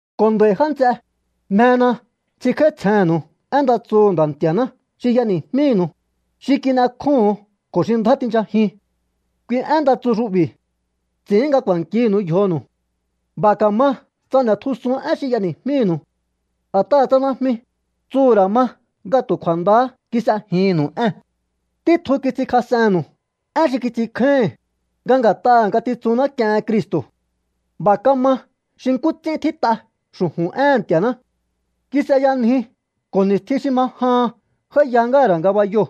Ko̱ nd'a̱i̱ já nts'e, mjena ts'inkj'áítsjennu̱u én nda tsuhu̱ Nda̱ Nti̱a̱ná xi y'eni̱jmínu̱u, xi kin'ekjóho̱on ko̱ xi ndjá tinchajiun. Kui én nda tsu xu'bi̱ ts'i̱ín nga k'u̱a̱nkinu̱u yjonu̱u. B'a̱ ka̱ma tsa n'e̱tjusun én xi y'eni̱jmínu̱u. A̱t'aha̱ tsa najmi, tsuhu̱ ra̱ ma nga tu̱ kju̱a̱ndahá kis'ejinnu̱u ée̱n. Títjun kits'inkjas'enu̱u én xi kits'inkjáíhi̱n, nga nga̱t'aha̱ ngatitsunná k'iehen Cristo̱. B'a̱ kama xi nkú ts'ín tjít'a xu̱ju̱n éhe̱n Nti̱a̱ná. Kis'eyanji ko̱ ni̱stjin xi ma jahan j'áíya ngáha̱ ra̱ ngabayoo̱,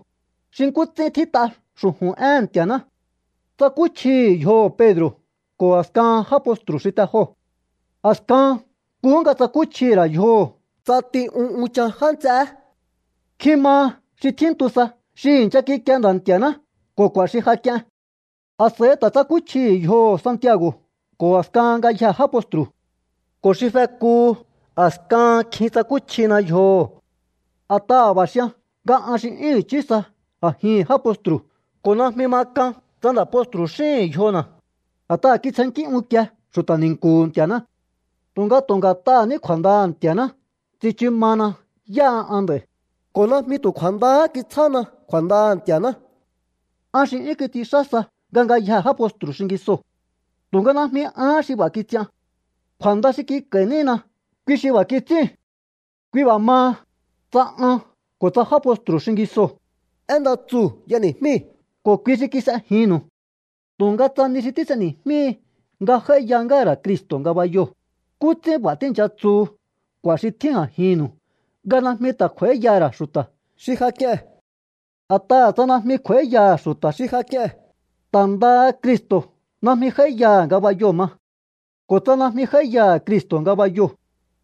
xi nkú ts'ín tjít'a xu̱ju̱n éhe̱n Nti̱a̱ná. Tsakúchjihi̱ yjoho̱ Pedro̱ ko̱ a̱skahan já postru̱ xi te joo̱. A̱skahan nkuhú nga tsakúchjihi̱ ra̱ yjoho̱ ts'ati un unchan já nts'eé. Nkjin maha xi tjíntu sa xi i̱ncha kikie Nda̱ Nti̱a̱ná ko̱ k'u̱a̱ xi ja k'ien. A̱s'a̱i ta̱ tsakúchjihi̱ yjoho̱ Santiago̱ ko̱ a̱skahan ngayjee̱ já postru̱. Ko̱ xi fekuhu, a̱skahan kjin tsakúchjina yjoho̱. A̱t'aha̱ b'a̱ xian nga an xi 'yún i̱chí sa a̱jihi̱n já postru̱ ko̱ najmi ma k'an tsa nda̱ postru̱ xíhi̱n yjona̱, a̱t'aha̱ kitsjennkí unkie xu̱ta̱ ni̱nku̱hu̱ Nti̱a̱ná. Tu̱nga tu̱ nga̱t'aha̱ ní kju̱a̱ndaha̱ Nti̱a̱ná tsichu mahana yáha an nd'a̱i̱, ko̱ najmi tu̱ kju̱a̱ndahá kitsjána kju̱a̱ndaha̱ Nti̱a̱ná. An xi 'yún kits'inxá sa nga ngayjee̱ já postru̱ xingisoo̱. Tu̱nga najmi ahán xi b'a̱ kits'ian. Kju̱a̱nda xi kik'a̱i̱ nína, kui xi b'a̱ kits'íu̱n. Kui b'a̱ maha, tsa an ko̱ tsa já postru̱ xingisoo̱, én nda tsuu̱ y'eni̱jmíi̱ ko̱ kui xi kis'ejinnu̱u. Tu̱nga tsa ni xi tís'eni̱jmíhi nga j'áíya ngáha̱ ra̱ Cristo̱ ngabayoo̱, ¿nkú ts'ín b'a̱ tíi̱ncha tsuhu k'u̱a̱ xi tjín a̱jinnu̱u nga najmi ta̱ kj'u̱a̱íyaha̱ ra̱ xu̱ta̱ xi ja k'ie̱n? A̱t'aha̱ tsa najmi kj'u̱a̱íyaha̱ xu̱ta̱ xi ja k'ie̱n, ta̱ ndaha Cristo̱ najmi j'áíyaha̱ ngabayoo̱ ma. Ko̱ tsa najmi j'áíyaha̱ Cristo̱ ngabayoo̱,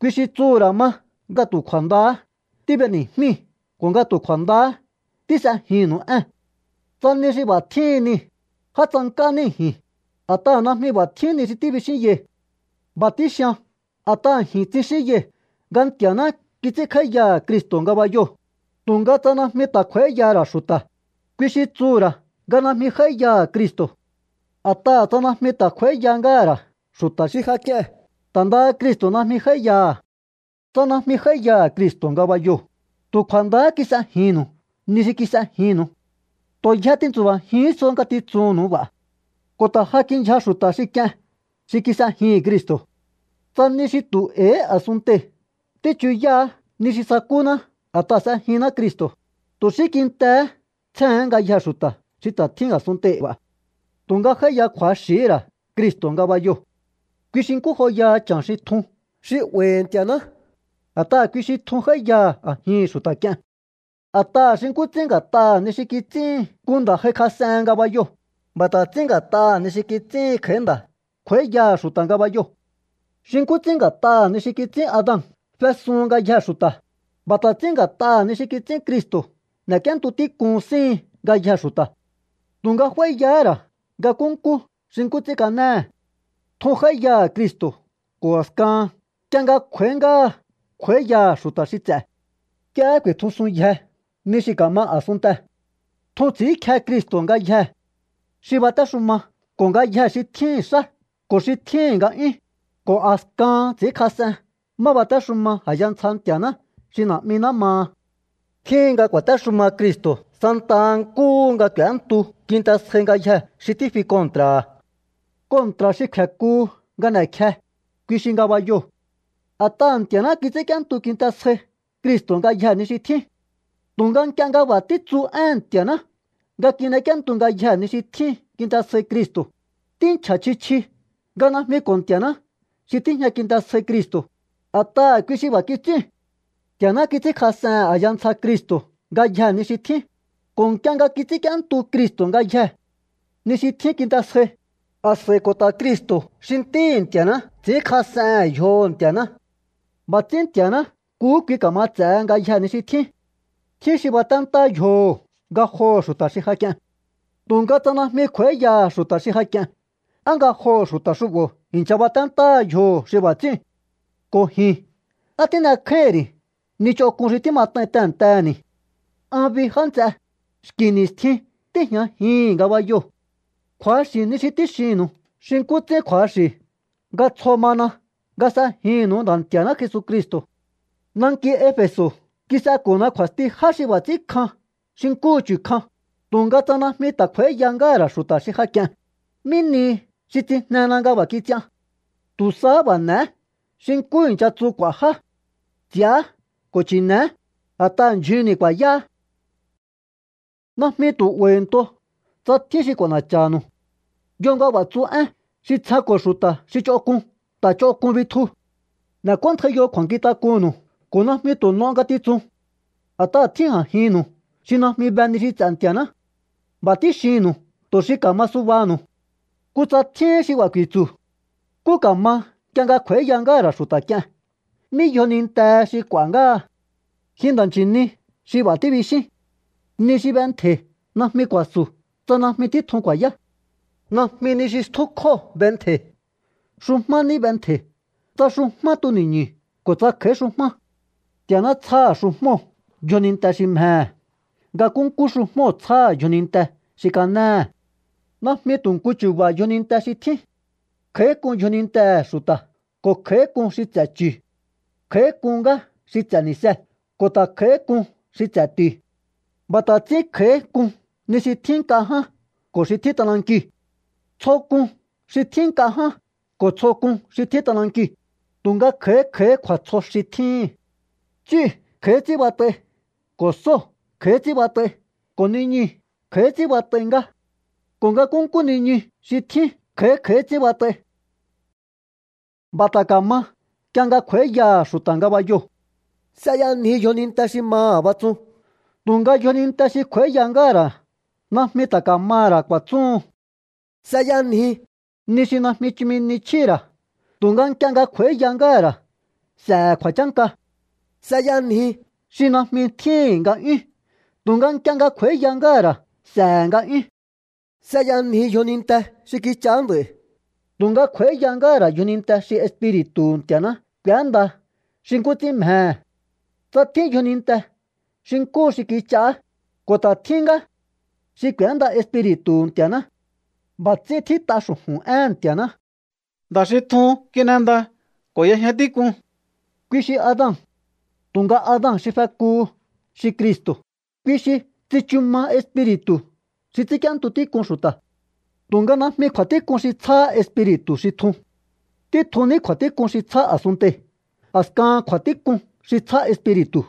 kui xi tsuhu̱ ra̱ ma nga tu̱ kju̱a̱ndahá tíb'eni̱jmíi̱ ko̱ nga tu̱ kju̱a̱ndahá tís'ejinnu̱u ée̱n. Tsa ni xi b'a̱ tjíhin nii̱, já tsank'á níi̱ ji̱n, a̱t'aha̱ najmi b'a̱ tjín ni xi tíbixínyai̱. B'a̱ tíxian a̱t'aha̱ ji̱n tsixínyai̱ nga Nti̱a̱ná kits'ínkj'áíyaha̱ Cristo̱ ngabayoo̱, tu̱nga tsa najmi ta̱ kj'u̱a̱íyaha̱ ra̱ xu̱ta̱, kui xi tsuhu̱ ra̱ nga najmi j'áíyaha̱ Cristo̱. A̱t'aha̱ tsa najmi ta̱ kj'u̱a̱íya ngáha̱ ra̱ xu̱ta̱ xi ja k'ie̱n, ta̱ ndaha Cristo̱ najmi j'áíyaha̱. Tsa najmi j'áíyaha̱ Cristo̱ ngabayoo̱, tu̱ kju̱a̱ndahá kis'ejinnu̱u ni xi kis'ejinnu̱u. Tu̱ yje tintsu̱ba̱jihín so ngatitsunnu̱u b'a̱. Ko̱ ta̱ ja kindyja xu̱ta̱ xi k'ien xi kis'ejihi̱n Cristo̱. Tsa ni xi tu̱ e̱i̱hí a̱sunntei̱ tíchuyáá ni xi sakúná a̱t'aha̱ s'ejinná Cristo̱, tu̱ xí kintehé tsjéhe̱én ngayjee̱ xu̱ta̱ xi ta̱ tjín a̱sunntei̱ b'a̱. Tu̱nga j'áíya kju̱axi̱hí ra̱ Cristo̱ ngabayoo̱. Kui xi nkú joyaha cha̱n xi tjun xi 'ba̱i̱hi̱ Nti̱a̱ná, a̱t'aha̱ kui xi tjun j'áíyaha̱ a̱jihi̱n xu̱ta̱ k'ie̱n. A̱t'aha̱ xi nkú ts'ín nga̱t'aha̱ ni xi kits'íhin nku nda̱ j'aikjas'ehen ngabayoo̱, b'a̱ ta̱ ts'ín nga̱t'aha̱ ni xi kits'íhin kj'a̱í nda̱ kj'u̱a̱íyaha̱ xu̱ta̱ ngabayoo̱. Xi nkú ts'ín nga̱t'aha̱ ni xi kits'ín Adan fesuhun ngayjee̱ xu̱ta̱, b'a̱ ta̱ ts'ín nga̱t'aha̱ ni xi kits'ín Cristo̱ n'e̱k'íéntu tík'un síhin ngayjee̱ xu̱ta̱. Tu̱nga f'áíyahá ra̱ nga nkúnkú xi nkú ts'ín kanéhe̱. Tjun j'áíyaha̱ Cristo̱ ko̱ a̱skahan nk'ie nga kj'u̱a̱í ngáha kj'u̱a̱íyaha̱ xu̱ta̱ xi ts'e̱. Nk'iehé ku̱i̱tjusunyje ni xi ka̱ma a̱sunntee̱. Tjun ts'i̱ínkje Cristo̱ ngayjee̱ xi batéxuma ko̱ ngayjee̱ xi tjíhi̱n xá ko̱ xi tjíhi̱n nga'yún, ko̱ a̱skahan ts'i̱ínkjas'en má batéxuma a̱ya ntsja Nti̱a̱ná xi Na̱'miná maha. Tjíhin nga ku̱a̱téxuma Cristo̱ santaha nkúhu nga k'u̱éntu kinte sjai ngayjee̱ xi tífi kontra̱ha̱. Kontra̱ xi kfe̱kuhu nga n'e̱kje, kui xi ngabayoo̱. A̱t'aha̱ Nti̱a̱ná kits'ínk'íéntu kinte sjai Cristo̱ ngayjee̱ ni xi tjín. Tu̱nga nk'ie nga b'a̱ títsu éhe̱n Nti̱a̱ná nga kin'ek'íéntu ngayjee̱ ni xi tjín kinte sjai Cristo̱, tínchja̱ chji chji nga najmi ko̱ Nti̱a̱ná xi tíjña kinte sjai Cristo̱, a̱t'aha̱ kui xi b'a̱ kits'íu̱n. Nti̱a̱ná kits'ínkjas'ehe̱n a̱ya ntsja Cristo̱ ngayjee̱ ni xi tjín, ko̱ nk'ie nga kits'ínk'íéntu Cristo̱ ngayjee̱ ni xi tjín kinte sjai, a̱s'a̱i ko̱ ta̱ Cristo̱ xi Ntíhi̱ Nti̱a̱ná ts'i̱ínkjas'ehe̱n yjoho̱ Nti̱a̱ná. B'a̱ ts'ín Nti̱a̱ná nkuhú kui ka̱ma ts'e̱he ngayjee̱ ni xi tjín. Tjín xi baténtá yjoho̱ ngajoho̱ xu̱ta̱ xi ja k'ie̱n. Tu̱nga tsa najmi kj'u̱a̱íyaha̱ xu̱ta̱ xi ja k'ie̱n, ¿á ngajoho̱ xu̱ta̱ xu'bo̱ i̱ncha baténtáha yjoho̱ xi b'a̱ ts'íu̱n? Ko̱ ji̱n, ¿á tín'ekjáíhi̱n ri̱ ni ch'onk'un xi tímat'ain tehe̱ntehe̱ni̱? An bi, já nts'e, xki̱ ni̱stjin tíi̱jñajihi̱n ngabayoo̱. Kju̱axi̱ ni xi tíxinnu̱u xi nkú ts'ín kju̱axi̱ nga tsjo mana nga s'ejinnu̱u Nda̱ Nti̱a̱ná Jesucristo̱. Nanki Efe̱so̱ kis'eko̱na kju̱a̱sti já xi b'a̱ ts'ín kjan xi nkúhu chu̱ kjan, tu̱nga tsa najmi ta̱ kj'u̱a̱íya ngáha̱ ra̱ xu̱ta̱ xi ja k'ie̱n, ¿mí nihi xi tsijnena nga b'a̱ kits'ian? Tu̱ sahá b'a̱ n'e̱é xi nkú i̱ncha tsu k'u̱a̱ já: “S'i̱á ko̱ chi̱ne̱é, a̱t'aha̱ ndyjunni̱ ku̱a̱yáá.” Najmi tu̱ 'ba̱i̱nto tsa tjín xi k'u̱a̱na̱cha̱nu̱u. Yo nga b'a̱ tsu én: “Xi tsjenko̱ xu̱ta̱ xi ch'onk'un, ta̱ ch'onk'un bitju.” N'e̱k'óntjaiyo kju̱a̱nkjintak'unnu̱u ko̱ najmi tu̱ n'o ngatitsun. A̱t'aha̱ tjín a̱jinnu̱u xi najmi be ni xi ts'e̱ Nti̱a̱ná. B'a̱ tíxinnu̱u tu̱ xi ka̱ma subaha̱nu̱u. Kutsa tjíhín xi b'a̱ ku̱i̱tsu̱: “¿Nkú ka̱ma nk'ie nga kj'u̱a̱íya ngáha̱ ra̱ xu̱ta̱ k'ie̱n? ¿Mí yjonintehe xi k'u̱a̱ ngáha?” ¡Ji nda̱ nchi̱ni xi b'a̱ tíbixín! Ni xi b'entje̱i̱ najmi ku̱a̱su̱ tsa najmi títjun ku̱a̱yá. Najmi ni xi stjúkjóo̱ b'entje̱i̱. Xujmá ní b'entje̱i̱, tsa xujmá tuni̱ñu̱ ko̱ tsa kj'a̱í xujmá. Nti̱a̱ná tsjáha̱ xujmóo̱ yjoninte xi mjehe̱. Nga nkúnkú xujmóo̱ tsjáha̱ yjoninte xi kanéhe̱. Najmi tu̱ nku chu̱ba̱ yjoninte xi tjín. Kj'a̱í k'un yjonintehe̱ xu̱ta̱ ko̱ kj'a̱í k'un xi ts'e̱ chu̱. Kj'a̱í k'un ngá xi ts'e̱ ni̱see̱ ko̱ ta̱ kj'a̱í k'un xi ts'e̱ ti̱u̱. B'a̱ ta̱ ts'ín kj'a̱í k'un ni xi tjín nk'a ján ko̱ xi tjín t'anankiu̱. Tsjo k'un xi tjín nk'a ján ko̱ tsjo k'un xi tjín t'anankiu̱, tu̱nga kj'a̱í kj'a̱í kju̱a̱tsjo xi tjíhi̱n. Ts'íu̱ kj'a̱í ts'ín bat'ai, ko̱ sóo̱ kj'a̱í ts'ín bat'ai, ko̱ niñuu̱ kj'a̱í ts'ín bat'ai ngá. Ko̱ nga nkúnkú niñu xi tjín kj'a̱í kj'a̱í ts'ín bat'ai. B'a̱ ta̱ ka̱ma nk'ie nga kj'u̱a̱íyaha̱ xu̱ta̱ ngabayoo̱. S'eyanji yjoninte xi maha̱ batsun, tu̱nga yjoninte xi kj'u̱a̱íya ngáha̱ ra̱ najmi ta̱ ka̱maha̱ ra̱ ku̱a̱tsúhun. S'eyanji ni xi najmi chumi ni chjíhi̱ ra̱, tu̱nga nk'ie nga kj'u̱a̱íya ngáha̱ ra̱ s'e̱he̱ kju̱a̱chánka. S'eyanji xi najmi tjíhi̱n nga'yún, tu̱nga nk'ie nga kj'u̱a̱íya ngáha̱ ra̱ s'e̱he̱ nga'yún. S'eyanji yjoninte xi kich'aá nd'a̱i̱, tu̱nga kj'u̱a̱íya ngáha̱ ra̱ yjoninte xi Espiri̱tu̱hu̱ Nti̱a̱ná k'u̱énda xi nkú ts'ín mjehe̱. Tsa tjín yjoninte xi nkúhu xi kich'aá, ko̱ ta̱ tjín ngá xi k'u̱énda Espiri̱tu̱hu̱ Nti̱a̱ná. B'a̱ ts'ín tjít'a xu̱ju̱n éhe̱n Nti̱a̱ná: “Nda̱ xi tjuu̱n kin'enda ko̱ y'ejña tík'un.” Kui xi Adan. Tu̱nga Adan xi fekuhu, xi Cristo̱, kui xi tsichu ma Espiri̱tu̱ xi ts'ínk'íéntu tík'un xu̱ta̱. Tu̱nga najmi kju̱a̱tík'un xi tsjáhá Espiri̱tu̱ xi tjun. Títjun ní kju̱a̱tík'un xi tsjá a̱sunntei̱, a̱skahan kju̱a̱tík'un xi tsjá Espiri̱tu̱.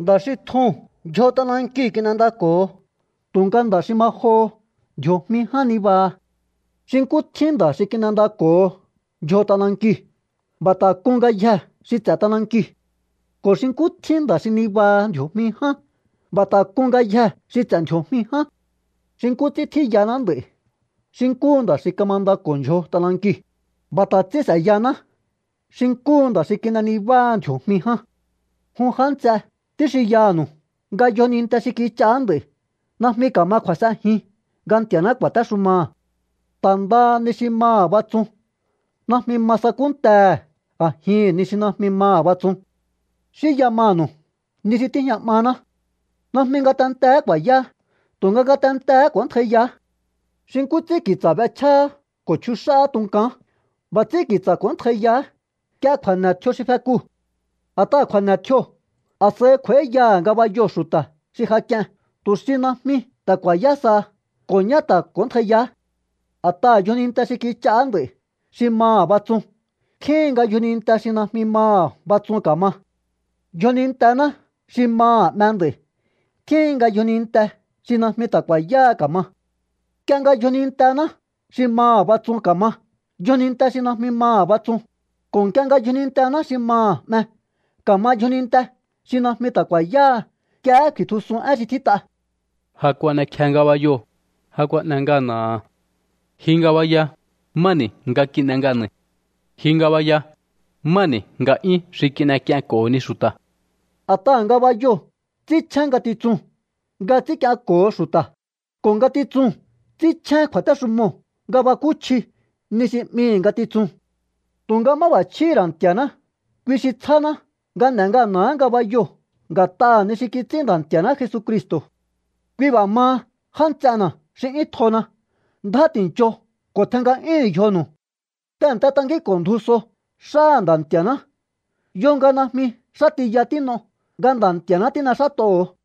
Nda̱ xi tjuu̱n ndyjo t'anankiu̱ kin'endako̱ho, tu̱nga nda̱ xi ma joho ndji̱o̱jmi ján nibaha. Xi nkú tjín nda̱ xi kin'endako̱ho ndyjo t'anankiu̱, b'a̱ ta̱ k'un ngayjee̱ xi ts'e̱ t'anankiu̱. Ko̱ xi nkú tjín nda̱ xi nibaha ndji̱o̱jmi ján, b'a̱ ta̱ k'un ngayjee̱ xi ts'e̱ ndji̱o̱jmi ján. Xi nkú ts'ín tjíyaná nd'a̱i̱ xi nkúhu nda̱ xi kamandako̱ho ndyjo t'anankiu̱, b'a̱ ta̱ ts'ín s'e̱yaná xi nkúhu nda̱ xi kin'e nibáha ndji̱o̱jmi ján. Jun já nts'e, tíxinyanu̱u nga yjoninte xi kich'aá nd'a̱i̱ najmi ka̱ma kju̱a̱s'enjin nga Nti̱a̱ná ku̱a̱téxumaha̱. Ta̱ ndaha ni xi maha̱ batsun najmi ma sakúntehe̱ a̱jihi̱n ni xi najmi maha̱ batsun. Xínya manu̱u ni xi tíjña 'maná. Najmi ngatenteé ku̱a̱yáá, tu̱nga ngatentee̱hé k'o̱óntjaiyaá. Xi nkú ts'ín ki̱tsa̱ b'echjáá ko̱ chjux'áá tunkaán, b'a̱ ts'ín ki̱tsa̱ k'o̱óntjaiyaá nk'ie kju̱a̱ne̱ tjio xi fekuu̱. A̱t'aha̱ kju̱a̱ne̱ tjioo̱, a̱s'a̱i kj'u̱a̱íyaha̱ ngabayoo̱ xu̱ta̱ xi ja k'ie̱n tu̱ xi najmi ta̱ ku̱a̱yá saha, ko̱ ñá ta̱ k'o̱óntjaiyaá. A̱t'aha̱ yjoninte xi kich'aá nd'a̱i̱ xi maha̱ batsun tjíhin nga yjoninte xi najmi maha̱ batsun ka̱ma. Yjonintená xi maha̱ 'me nd'a̱i̱ tjíhin nga yjoninte xi najmi ta̱ ku̱a̱yáha ka̱ma. Nk'ie nga yjonintená xi maha̱ batsun ka̱ma yjoninte xi najmi maha̱ batsun, ko̱ nk'ie nga yjonintená xi maha̱ 'me ka̱ma yjoninte xi najmi ta̱ ku̱a̱yáha, nk'iehé ku̱i̱tjusun én xi tjít'a: Ja kuan'ekje ngabayoo̱, ja kuan'e ngana̱ha̱. Ji ngabaya, ¿má ni̱ nga kin'e ngana̱i̱? Ji ngabaya, ¿má ni̱ nga'yún xi n'ek'ienko̱honi xu̱ta̱? A̱t'aha̱ ngabayoo̱ ts'ínchjén ngatitsuu̱n nga ts'ínk'ienko̱ho xu̱ta̱, ko̱ ngatitsuu̱n ts'ínchjén kju̱a̱téxumoo̱ nga bakúchji ni xi 'mihi̱ ngatitsuu̱n. Tu̱nga máb'a̱chjíhi̱ ra̱ Nti̱a̱ná, kui xi tsjáná nga n'e ngana̱áha̱ ngabayoo̱ nga̱t'aha̱ ni xi kits'ín Nda̱ Nti̱a̱ná Jesucristo̱. Kui b'a̱ maha, já nts'ena̱ xi 'yún tjona, ndjá ti̱ncho ko̱ tjen nga'yúhu̱un yjonu̱u. Tehe̱nte tankínko̱ ndju so xáha̱ Nda̱ Nti̱a̱ná. Yo nga najmi xá tiya tín'o nga Nda̱ Nti̱a̱ná tín'exát'oho̱o.